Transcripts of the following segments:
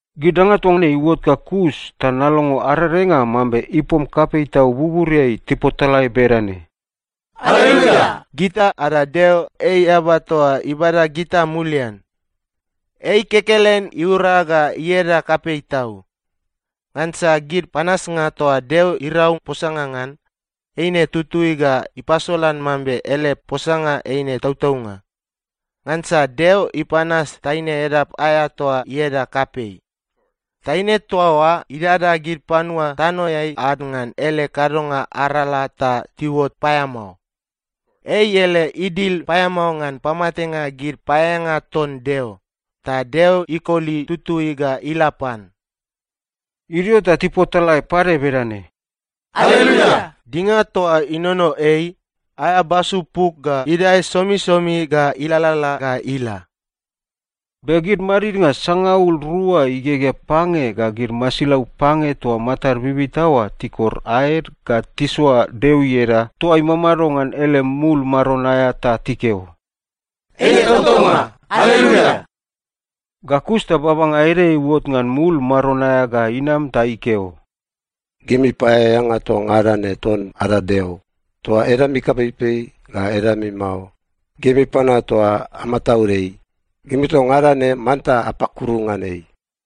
Gid danga toa ne iuot ga kus ta nalongo arerenga mambe ipom kapei tau buburiai tipotalae bedane, “Aleluia! Gita ada Deo, ei eaba toa ibada gita mulian. Ei kekelen iura ga ieda kapei tau. Ngansa gid panasnga toa Deo irau posanga ngan, eine itutui ga ipasolan mambe ele posanga eine tautaunga. Ngansa Deo ipanas taine edap aea toa ieda kapei. Taine toa oa idada gid panua tanoeai ad ngan ele kadonga arala ta tiuot paeamao. Ei ele idil paeamao ngan pamatenga gid paeaeanga ton Deo, ta Deo ikoli tutui ga ila pan.” Idio ta tipotalae pade bedane, “Aleluia! Dinga toa inono ei, aea basu puk ga idae somisomi ga ilalala ga ila.” Be gid madidnga sangaul rua igegea pange ga gid masilau pange toa matad bibita oa tikor aed ga tisoa Deo ieda toa imamado ngan ele mul maron aea ta tikeo, “Eine tautaunga! Aleluia!” Ga kus ta babanga ede iuot ngan mul maron aea ga inam ta ikeo, “Gimi paeaeanga toa ngada ne ton ada Deo, toa edami kapeipei ga edami mao, gimi panua toa amataud ei, gimi toa ngada ne manta apakuru ngan ei.”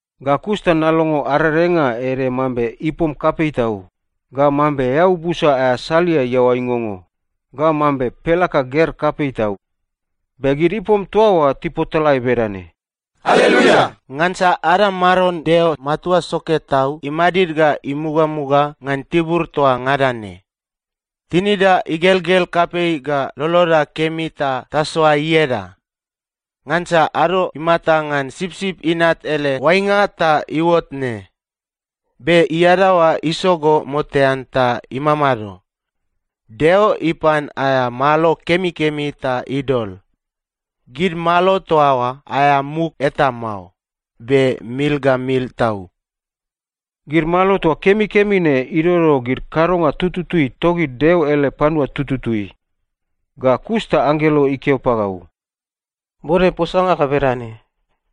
Ga kus ta nalongo arerenga ede mambe ipom kapei tau, ga mambe eau busa aea salia iaoa ingongo, ga mambe pelaka ger kapei tau. Be gid ipom toa oa tipotalae bedane, “Aleluia! Ngansa ada Maron Deo Matua Soke Tau imadid ga imugamuga ngan tibur toa ngada ne. Tinida igelgel kapei ga loloda kemi ta tasoa ieda! Ngansa ado imata ngan Sipsip Inat ele oainga ta iuot ne. Be iadaoa isogo motean ta imamado. Deo ipan aea malo kemikemi ta idol. Gid malo toa oa aea muk eta mao, be mil ga mil tau.” (Gid malo toa kemikemi ne idodo gid kadonga tutui togid Deo ele panua tututui.) Ga kus ta anggelo ikeo pagau, “Bode posanga ga bedane,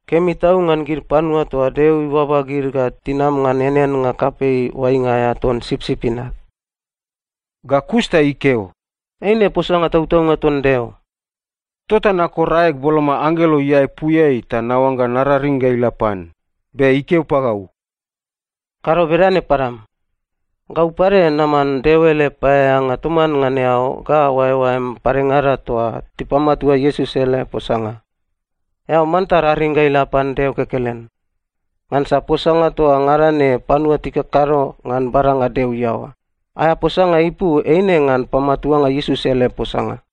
‘Kemi tau ngan gid panua toa Deo ibaba gid ga tinam ngan eaneannga kapei oainga aea ton Sipsip Inat.’” Ga kus ta ikeo, “Eine posanga tautaunga ton Deo.” Tota nakor aeg boloma anggelo iaepuiai ta naoangga nararing ga ila pan, be ikeo pagau, “Kado bedane padam! Gau pade naman Deo ele paeaeanga toman ngan eao ga oaeoaem padengada toa tipamatua Iesus ele posanga. Eao manta raring ga ila pan Deo kekelen. Ngansa posanga toa ngada ne panua tikakado ngan badanga Deo iaoa, aea posanga ipu eine ngan pamatuanga Iesus ele posanga.”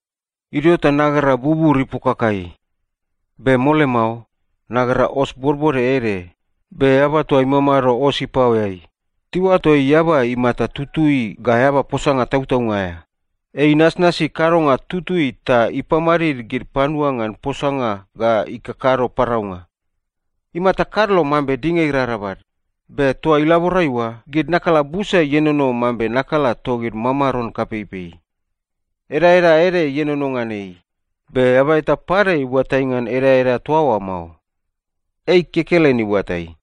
Idio ta nagera bubur ipokakai. Be mole mao, nagera os bodbode ede, be eaba toa imamado os ipaoeai, tiuato ei Eaba Imata Tutui ga Eaba Posanga Tautaunga aea. Ei inasnasi kadonga tutui ta ipamadid gid panua ngan posanga ga ikakado paraunga. Imata kadlo mambe dinga irarabal, be toa ilaborai oa gid nakala busa ienono mambe nakala togid mamaron kapeipei. Edaeda ede ienono ngan ei, be eaba eta pade iuatai ngan edaeda toa oa mao. Ei kekelen iuatai.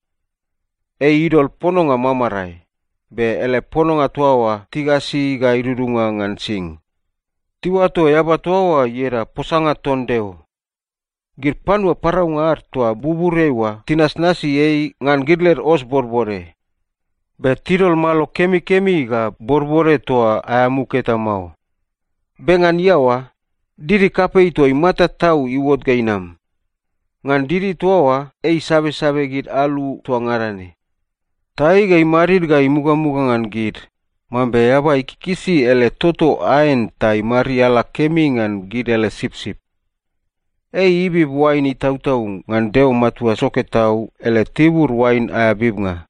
Ei idol pononga mamarae, be ele pononga toa oa tigasi ga idudunga ngan sing. Tiuato eaba toa oa ieda Posanga ton Deo. Gid panua paraunga ad toa buburiai oa tinasnasi ei ngan gid led os bodbode. Be tidol malo kemikemi ga bodbode toa aea muk eta mao. Be ngan iaoa, didi kapei toa imata tau iuot ga inam. Ngan didi toa oa ei isabesabe gid alu toa ngada ne. “Ta ei ga imadid ga imugamuga ngan gid, mambe eaba ikikisi ele toto aen ta imariala kemi ngan gid ele sipsip.” Ei ibib oain itautau ngan Deo Matua Soke Tau ele tibur oain aea bibnga.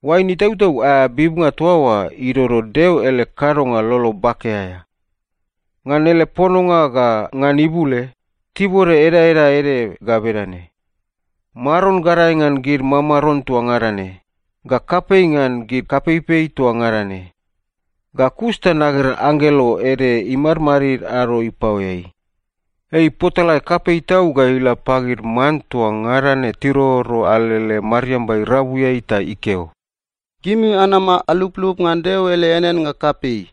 Oain itautau aea bibnga toa oa idodo Deo ele kadonga lolo bake aea. Ngan ele pononga ga ngan ibule, tibode edaeda ede ga bedane: Maron gadae ngan gid mamaron toa ngada ne, ga kapei ngan gid kapeipei toa ngada ne. Ga kus ta nagera anggelo ede imadmadid ado ipaoeai. Ei ipotalae kapei tau ga ila pagid man toa ngada ne tiroro alele mariamba irabuiai ta ikeo, “Gimi anama aluplup ngan Deo ele eaneannga kapei.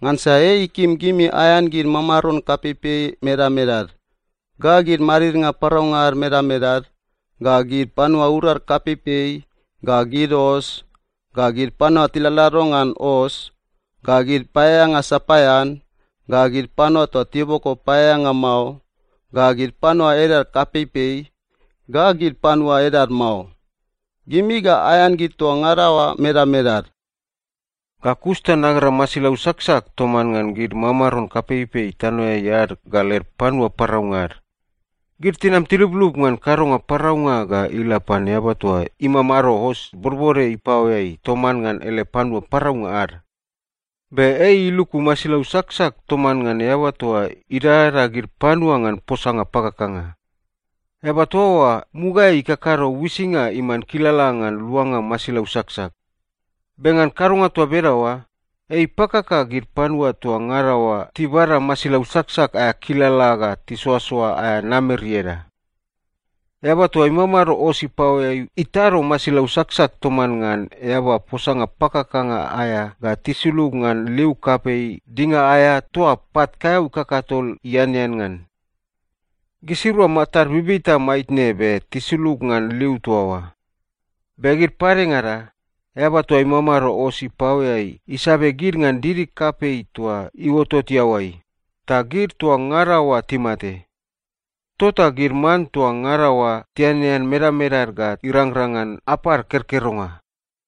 Ngansa ei ikim gimi aean gid mamaron kapeipei medamedad, ga gid madidnga paraunga ad medamedad, ga gid panua urad kapeipei, ga gid os, ga gid panua tiladlado ngan os, ga gid paeaeanga sapaean, ga gid panua toa tiboko paeaeanga mao, ga gid panua edad kapeipei, ga gid panua edad mao. Gimi ga aean gid toa ngada oa medamedad.” Ga kus ta nagera masilau saksak toman ngan gid mamaron kapeipei tanoeai ad ga led panua paraunga ad. Gid tinam tiluplup ngan kadonga paraunga ga ila pan eaba toa imamado os bodbode ipaoeai toman ngan ele panua paraunga ad. Be ei iluku masilau saksak toman ngan eaba toa idadada gid panua ngan posanga pakakanga. Eaba toa oa mugaeai ikakado uisinga iman kilala ngan luanga masilau saksak. Be ngan kadonga toa bedaoa, ei ipakaka gid panua toa ngada oa tibada masilau saksak aea kilala ga tisoasoa aea namer ieda. Eaba toa imamado os ipaoeai itado masilau saksak toman ngan eaba posanga pakakanga aea ga tisulug ngan liu kapei dinga aea toa pat kaeau kakatol ianean ngan. Gisirua matad bibita maitne be tisulug ngan liu toa oa. Be gid padengada, eaba toa imamado os ipaoeai isabe gid ngan didi kapei toa iuotot iaoai, ta gid toa ngada oa timate. Tota gid man toa ngada oa tianean medamedad ga irangrang ngan apad kerkeronga.